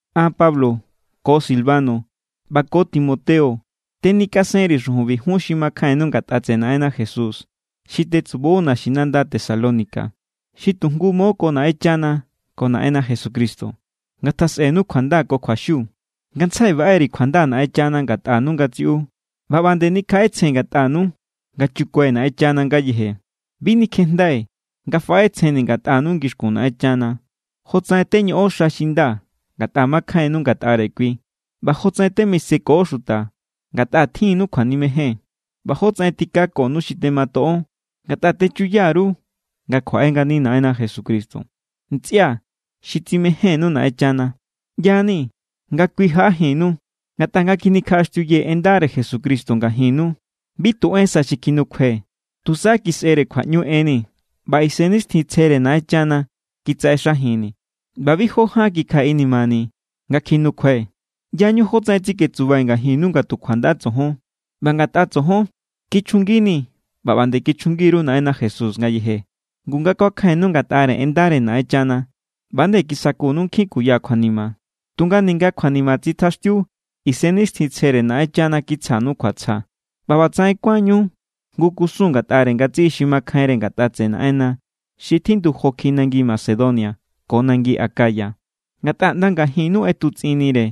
An, Pablo, ko Silvano ꞌba ko Timoteo tenikasenri̱ xujunbi jun xi makjainnu ngatꞌa tseꞌe Naꞌenna Jesús xi tetsubo naxinanda Tesalónica, xi tu jngu mo ko Naꞌenchana ko Naꞌenna Jesucristo. Ngatjasꞌenu kjuanda ko kjuaxiu. Ngantsjai baꞌe_ri̱ kjuanda Naꞌenchana ngatꞌanu ngatsiꞌu, ꞌba ꞌba nde nikjaꞌetsjen ngatꞌanu nga chukue̱ Naꞌenchana ngayeje. Bi nikjejndai̱ nga faꞌetsjenni̱ ngatꞌanu ngixkun Naꞌenchana, jotsaꞌen teñoꞌon xa xi nda ngatꞌa makjainnu ngatꞌare kui, ꞌba jotsaꞌen temiseko xuta ngatꞌa tjinnu kjuanimejen, ꞌba jotsaꞌen tikakonu xi tematoꞌon ngatꞌa techuya_ru nga kjuaꞌe ngani Naꞌenna Jesucristo. Ntsꞌia̱ xi tsimejénnu Naꞌenchana, ꞌya=ni nga kui jaꞌajinnu. Ngatꞌa nga kjinikjaꞌaxtiuyee̱ en ndare Jesucristo ngajinnu, bi tu en sa xi kjinukjuai̱. Tusa kisꞌere kjuaꞌñu enni̱, ꞌba Isennixtjintsjere Naꞌenchana kitsaꞌexajinni̱, ꞌba bi jó ján kikjai̱ inimani̱ nga kjinukjuai̱. ꞌYañu jótsaꞌen tsiketsubai̱ ngajinnu nga tu kjuanda tsojon. ꞌBa ngatꞌa tsojon, kichjunginii̱ ꞌba ꞌba nde kichjungi_ru Naꞌenna Jesús ngayeje. Ngu nga kuakjainnu ngatꞌare en ndare Naꞌenchana, ꞌba=nde kisakunu nkjin kuya kjuanima. Tunga ninga kjuanima tsitjaxtiu, Isennixtjintsjere Naꞌenchana kitsjanu kjuatsja. ꞌBa ꞌbatsaꞌen kuánñu jngu kusun ngatꞌare ngatsiꞌi xi makjainre ngatꞌa tseꞌe Naꞌenna xi tjindu jo kjiꞌi nangi Macedonia ko nangi Acaya. Ngatꞌa ꞌnda ngajinnu ꞌetutsꞌinnire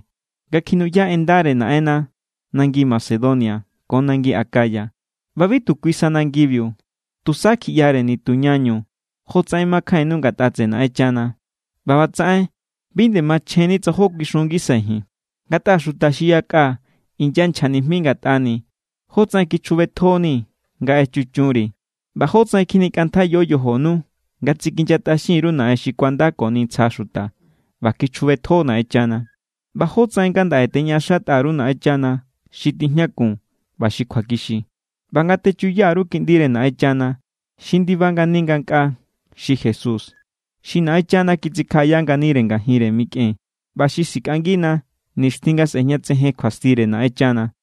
nga kjinuꞌya en ndare Naꞌenna nangi Macedonia ko nangi Acaya. ꞌBa bi tu kui sa nangibiu, tusa kjiꞌyare nitu ñañu jótsaꞌen makjainnu ngatꞌa tseꞌe Naꞌenchana, ꞌba ꞌbatsaꞌen bi nde machjenni tsa jó kuixun ngisai̱ ji̱n. Ngatꞌa xuta xi yakꞌa inyanchja nijmi ngatꞌani̱ jótsaꞌen kichjubetjonii̱ nga echuchunri̱ ꞌba jótsaꞌen kjinikꞌantjaiyo yojonu nga tsikinyatꞌaxin_ru naꞌen xi kuandakoni ntsja xuta ꞌba kichjubetjo Naꞌenchana. ꞌBa jótsaꞌen ngandaꞌe teñaꞌaxatꞌa_ru Naꞌenchana xi tijñakun ꞌba xi kjuakixi ꞌba nga techuya_ru Kiꞌndire Naꞌenchana xi ndiba ngani ngankꞌaa. Xi Jesús, xi Naꞌenchana kitsikjaꞌaya nganire ngajinre mikꞌen ꞌba xi sikꞌangina nixtjin nga sꞌe̱jñatsejen kjuastire Naꞌenchana.